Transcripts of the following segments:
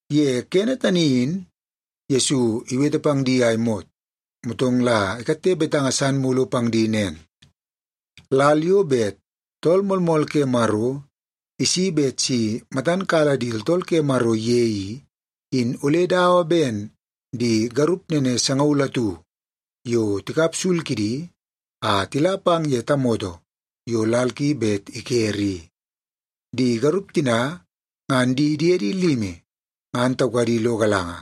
Ye kene tani in Yesu iwete pang di a imot, motong la ikatte betanga san mulu pang di nen, “Lal yo bet Tool Moolmool ke Maro isi bet si matan kala di tooltool ke Maro ye i, in ole dawa ben di garup nene sangaul atu yo tikap sul kidi a tila pang ye tamoto yo lal ki bet ikere i. Di garup tina ngan di diedi limi ngan taukadi lo galanga,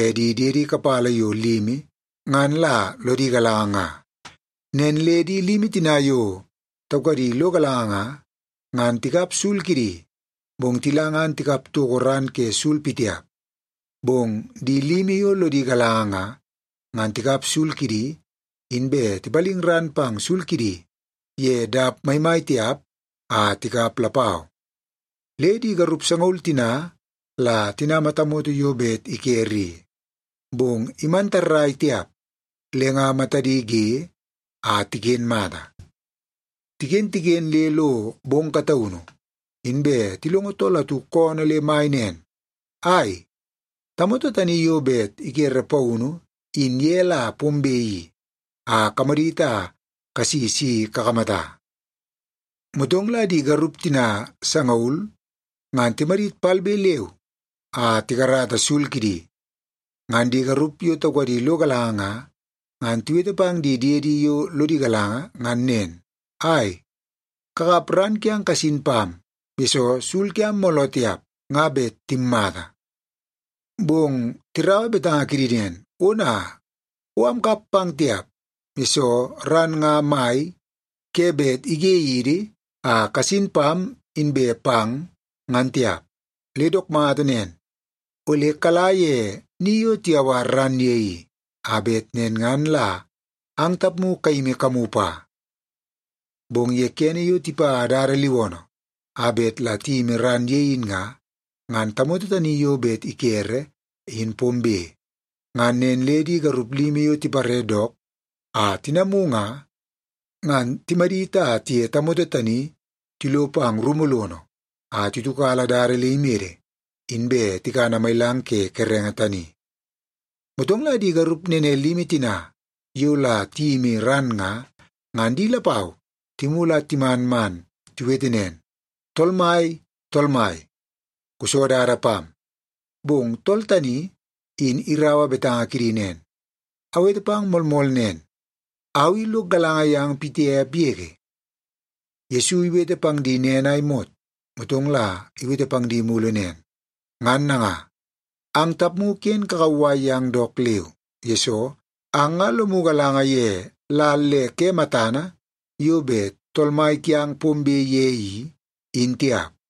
e di diedi kapala yo limi ngan la lodi galanga nga. Nen le di limi tina yo taukadi lo galanga nga, ngan tikap sul kidi, bong tila ngan tikap toko ran ke sul pitiap. Bong di limi yo lodi galanga nga, ngan tikap sul kidi, inbe tipaling ran pang sul kidi ye dap maimai tiap a tikap lapau. Le di garup sangaul tina la tinama tamoto yo bet ikere i, bong iman tarrai tiap le nga matadi ge a tiken mata. “Tiken, tiken le lo bong kataunu, inbe tilongo tool atu koonoo le mai nen, ‘Ai, tamoto tani yo bet ikere paunu in ye la pombe i, a kamadit a kasi si kakamata.’ “Motong la di garup tina sangaul ngan timadit palbe leu a tikarata sul kidi. Ngan di garup yo taukadi lo galanga nga, ngan tiwete pang di diedi yo lodi galanga ngan nen, ‘Ai, kakap ran kiang kasin pam, yesoo sul kiam mooloo tiap nga bet timmata.’ “Bong tiraua betanga kidi nen, ‘Ona, o amkap pang tiap, yesoo ran nga mai ke bet ige yidi a kasin pam inbe pang, ngan tiap. Le dook mata nen, ole kala ye ni yo tiyawar ran ye i, a bet nen ngan la ang tapmu kayimi kamu pa.’ “Bong ye kene yo tipa dada liwoonoo a bet la tiyimi ran ye in nga, ngan tamoto tani yo bet ikere, in pombe. Ngan nen le di garup limi yo tipare dook a tinamu nga, ngan timadit a tiye tamoto tani tilo pang rumu lono a titiukala dada le imede, inbe tikana mailang ke kerenge tani. “Motong la di garup nene limi tina yo la tiyimi ran nga, ngan di lapau timulu a timan man tiwete nen, ‘Tool mai, tool mai, kuso dada pam!’ “Bong tool tani in iraua betanga kidi nen, ‘Awete pang moolmool nen, au i lok galanga yang pitiap yege.’” Yesu iwete pang di nen a imot, motong la iwete pang di mulu nen, “Ngan nanga, ang tapmu ken kakauwai yang dook leu, yesoo ang nga lomu galanga ye lal le ke matana yo bet Tool Mai kiang pombe ye i, in tiap.”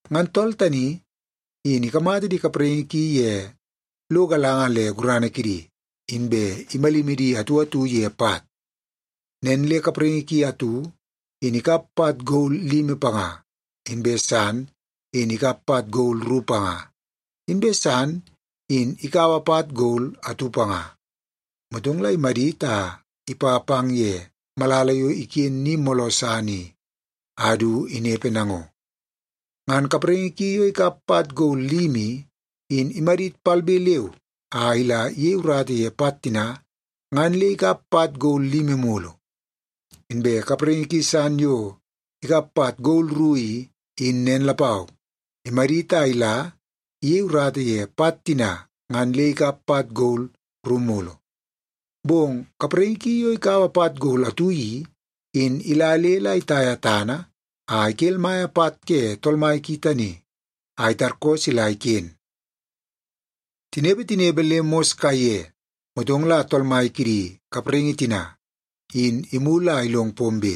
Ngan tool tani in ikamata di kapraingi ki ye lo galanga le gurana kidi, inbe imalimi di atu atu ye pat. Nen le kapraingi ki atu in ikap pat gol limi panga, inbe san in ikap pat gol ru panga, inbe san in ikaua pat gol atu panga. Motong la imadit a ipa pang ye malala yo iken ni mooloo san i, a du inepe nango. Ngan kapraingi ki yo ikap pat gol limi i, in imadit palbe leu a ila iyei urata ye pat tina, ngan le ikap pat gol limi mulu. Inbe kapraingi ki san yo ikap pat gol ru i, in nen lapau, imadit a ila iyei urata ye pat tina, ngan le ikap pat gol ru mulu. Bong kapraingi ki yo ikaua pat gol atu i, in ila le la itaia tana a ikelmaia pat ke tool mai ki tani a itarkoo sila iken. “Tinepe, tinepe le mos kaiye, motong la tool mai kidi kapraingi tina, in imulu a ilong pombe.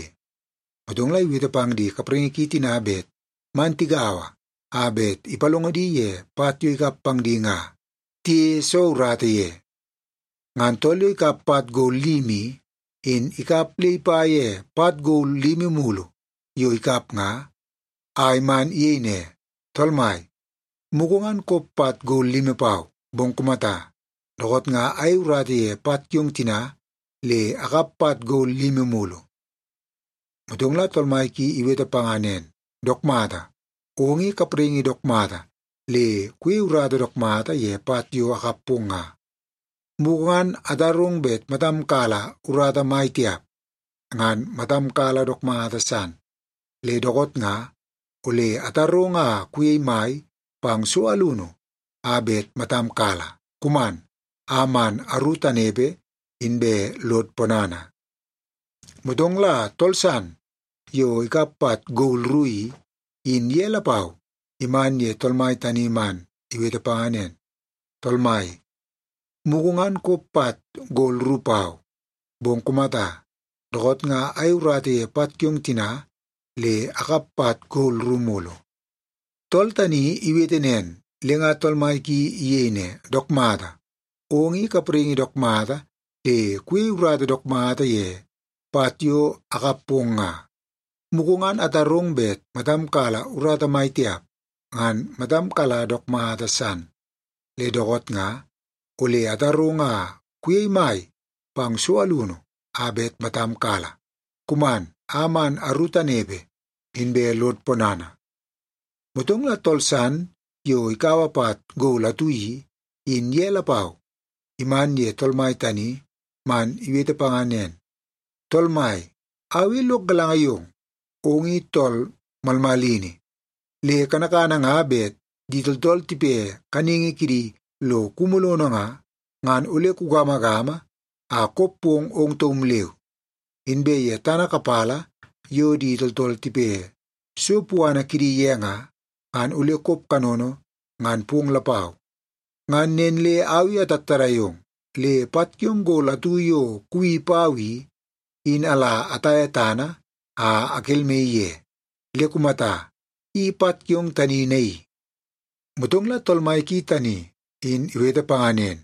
Motong la iwete pang di kapraingi ki tina bet man tigaua a bet ipalongo di ye pat yo ikap pang di nga tiyeie soo urata ye. Ngan tool yo ikap pat gol limi i, in ikap le ipa ye pat gol limi mulu yo ikap nga, a iman iyei ne, ‘Tool mai, mugu ngan kop pat gol limi pau, bong kumata, dookoot nga ayei urata ye pat kiong tina le akap pat gol limi mulu.’ “Motong la tool mai ki iwete panga nen, ‘Dook mata! Ong i kapraingi dook mata le kuyei urata dook mata ye pat yo akap pong nga! Mugu ngan atarong bet matam kala urata mai tiap, ngan matam kala dook mata san. Le dookoot nga ole atarong a kuyei mai pang so alunu a bet matam kala. Kuman a man aru tanepe, inbe lod ponana.’ “Motong la tool san yo ikap pat gol ru i, in ye lapau iman ye tool mai tani man iwete panga nen, ‘Tool mai, mugu ngan kop pat gol ru pau, bong kumata, dookoot nga ayei urata ye pat kiong tina le akap pat gol ru mulu.’ “Tool tani iwete nen, le nga tool mai ki iyei ne, ‘Dook mata! Ong i kapraingi dook mata le kuyei urata dook mata ye pat yo akap pong nga! Mugu ngan atarong bet matam kala urata mai tiap, ngan matam kala dook mata san. Le dookoot nga ole atarong a kuyei mai pang so alunu a bet matam kala. Kuman a man aru tanepe, inbe lod ponana.’ “Motong la tool san yo ikaua pat gol atu i, in ye lapau iman ye tool mai tani man iwete panga nen, ‘Tool mai, au i lok galanga yong. Ong i tool malmalini, le kanakana nga bet di tooltool tipe kaningi kidi lo kumu lono nga, ngan ole kugamagama a kop pong ong taum leu. Inbe ye tana kapala yo di tooltool tipe so puana kidi ye nga, ngan ole kop kanono ngan pong lapau. Ngan nen le au i atattadai ong, le pat kiong gol atu yo kuwi pau i, in ala ataia tana a akelmaii ye. Le kumata, i pat kiong tani naii.’ “Motong la tool mai ki tani in iwete panga nen,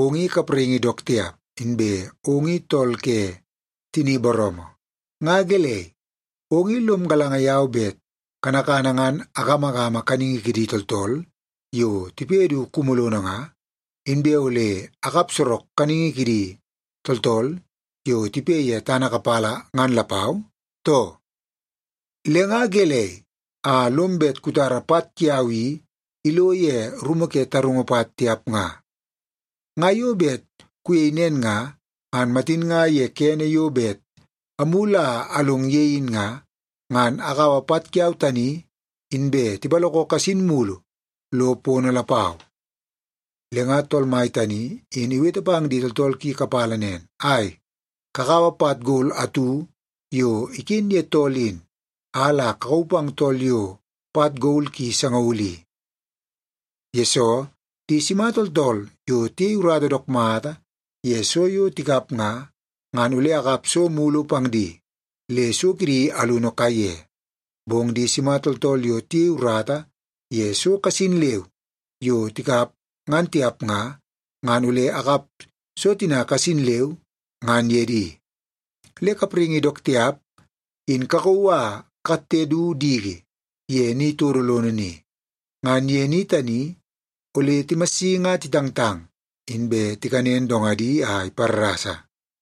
‘Ong i kapraingi dook tiap, inbe ong i tool ke tini booroomoo. Nga gelei, ong i lom galanga yau bet kanakana ngan agamagama kaningi kidi tooltool yo tipe du kumu lono nga, inbe ole akap sorok kaningi kidi tooltool yo tipe ye tana kapala ngan lapau, too? Le nga gelei a lom bet kutara pat kiau i ilo ye rumu ke tarungu pat tiap nga? Nga yo bet kuyei nen nga, ngan matin nga ye kene yo bet amulu a along ye in nga, ngan akaua pat kiau tani, inbe tipaloko kasin mulu lo pono lapau.’ “Le nga tool mai tani in iwete pang di tooltool ki kapala nen, ‘Ai, kakaua pat gol atu yo iken ye tool in, a la kakauu pang tool yo pat gol ki sangaul i. Yesoo, di sima tooltool yo tiyei urata dook mata ye so yo tikap nga, ngan ole akap so mulu pang di, le so kidi alunu kaiye. Bong di sima tooltool yo tiyei urata ye so kasin leu yo tikap ngan tiap nga, ngan ole akap so tina kasin leu, ngan ye di. Le kapraingi dook tiap, in kakauu a kakatte du diki ye ni todo lono ni. Ngan ye ni tani, ole timassingi a titangtang, inbe tikanen dongadi a iparrasa.’”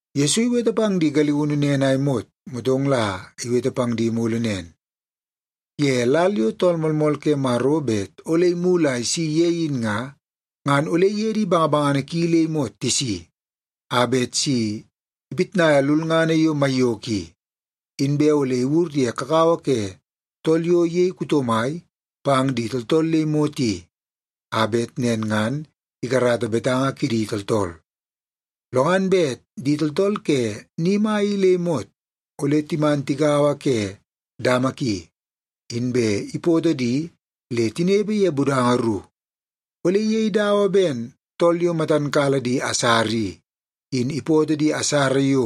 Yesu iwete pang di galiunu nen a imot, motong la iwete pang di mulu nen, “Ye lal yo Tool Moolmool ke Maro bet ole imulu a isi ye in nga, ngan ole iye di bangabangana ki le imot tisi, a bet si ipitnaia lulngana yo maiyoko i. Inbe ole iwur ye kakawa ke tool yo iyei kuto mai pang di tooltool le imot i, a bet nen ngan ikarata betanga kidi tooltool. Lo ngan bet di tooltool ke ni mai i le imot, ole timan tigaua ke dama ki, inbe ipoto di le tinepe ye budanga ru. Ole iyei dawa ben tool yo matan kala di asara i, in ipoto di asara yo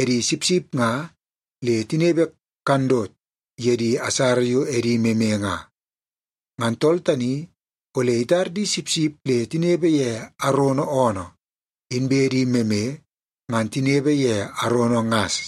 edi sipsip nga le tinepe kandot ye di asara yo edi meme nga. Ngan tool tani ole itar di sipsip le tinepe ye arono oonoo, inbe di meme ngan tinepe ye arono ngas.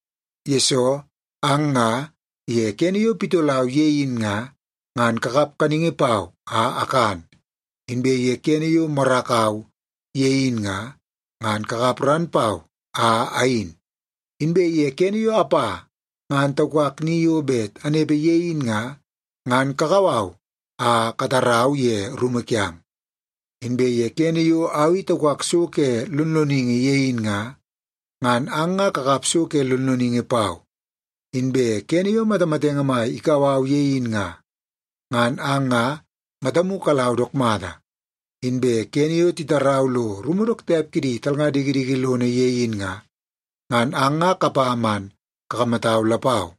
Yesoo ang nga ye kene yo pitolau ye in nga, ngan kakap kaningi pau a akan. Inbe ye kene yo morakau ye in nga, ngan kakap ran pau a ayin. Inbe ye kene yo apa ngan taukak ni yo bet anepe ye in nga, ngan kakau au a katarau ye rumu kiang. Inbe kene yo au i taukak so ke lonloningi ye in nga, ngan ang nga kakap so ke lonloningi pau. Inbe kene yo matamatenge mai ikau au ye in nga, ngan ang nga matamu kalau dook mata. Inbe kene yo titarau lo rumu dook tiap kidi talnga dikidiki lono ye in nga, ngan ang nga kapa man kakamatau lapau.’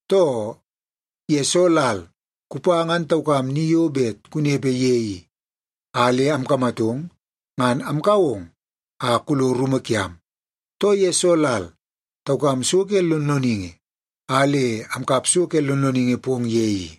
Too, ye soo lal kupa ngan taukam ni yo bet kunepe ye i, a le amkamatong ngan amkau ong a kulo rumu kiam, too ye soo lal taukam so ke lonloningi, a le amkap so ke lonloningi pong ye i?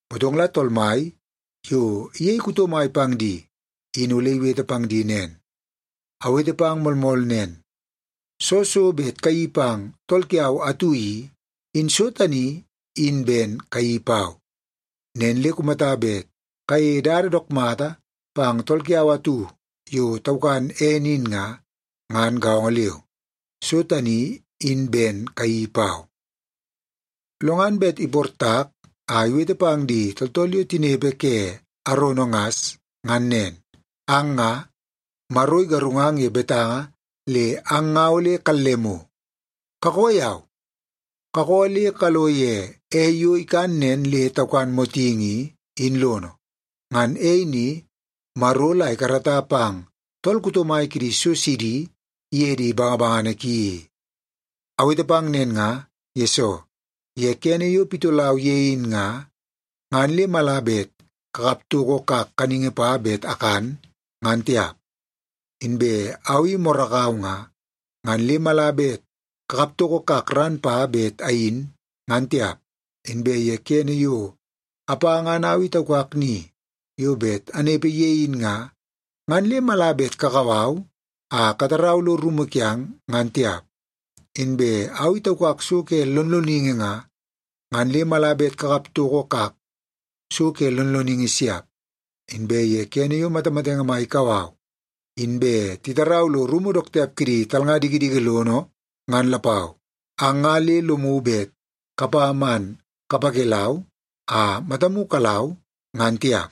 “Motong la Tool Mai yo iyei kuto mai pang di in ole iwete pang di nen, ‘Awete pang moolmool nen, soo so bet kayeii pang tool kiau atu i, in so tani in ben kayeii pau. Nen le kumata bet kayeie dada dook mata pang tool kiau atu yo taukan ene in nga, ngan gaongo leu, so tani in ben kayeii pau.’ “Lo ngan bet iportak a iwete pang di tooltool yo tinepe ke arono ngas ngan nen. ‘Ang nga, Maro igarungang ye betanga le ang nga ole kallemu. Kakoo yau! Kakoo le kalo ye ei yo ikan nen le taukan motingi i, in lono. Ngan ei ni Maro la ikarata pang tool kuto mai kidi so sidi iye di bangabangana ki i. Awete pang nen nga, yesoo ye kene yo pitolau ye in nga, ngan le mala bet kakap toko kak kaningi pa bet akan, ngan tiap. Inbe au i morakau nga, ngan le mala bet kakap toko kak ran pa bet ayin, ngan tiap. Inbe ye kene yo apa ngan au i taukak ni yo bet anepe ye in nga, ngan le mala bet kakau au a katarau lo rumu kiang, ngan tiap. Inbe au i taukak so ke lonloningi nga, ngan le mala bet kakap toko kak so ke lonloningi siap. Inbe ye kene yo matamatenge mai ikau au, inbe titarau lo rumu dook tiap kidi talnga dikidiki lono ngan lapau, ang nga le lomu bet kapa man kapakelau a matamu kalau, ngan tiap.’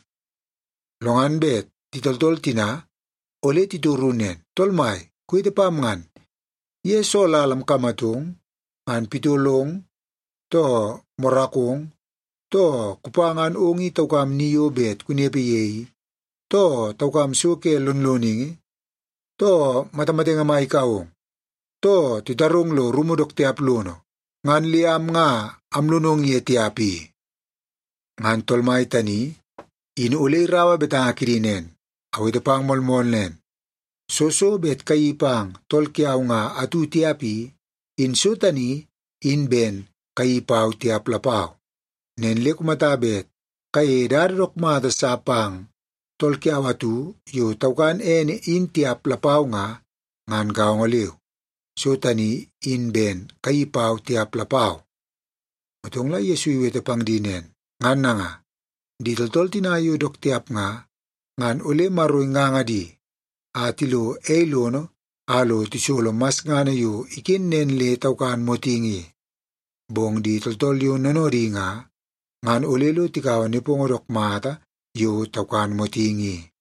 “Lo ngan bet di tooltool tina ole titoru nen, ‘Tool Mai, kuwete pam ngan. Ye soo lal amkamatong ngan pitolong, too morakong, too kupa ngan ong in taukam ni yo bet kunepe ye i, too taukam so ke lonloningi, too matamatenge mai kau ong, too titarong kulo rumu dook tiap lono, ngan le am nga amlonong ye tiap i?’ “Ngan Tool Mai tani in ole iraua betanga kidi nen, ‘Awete pang moolmool nen. Soo so bet kayeii pang tool kiau nga atu tiap i, in so tani in ben kayeii pau tiap lapau. Nen le kumata bet kayeie dada dook mata sa pang tool kiau atu yo taukan ene, in tiap lapau nga, ngan gaongo leu, so tani in ben kayeii pau tiap lapau.’” Motong la Yesu iwete pang di nen, “Ngan nanga, di tooltool tina yo dook tiap nga, ngan ole Maro inganga di a tilo ei lono a lo tisolo masngana yo iken nen le taukan motingi i. Bong di tooltool yo noonoodi nga, ngan ole lo tikaua nepongo dook mata yo taukan motingi i.”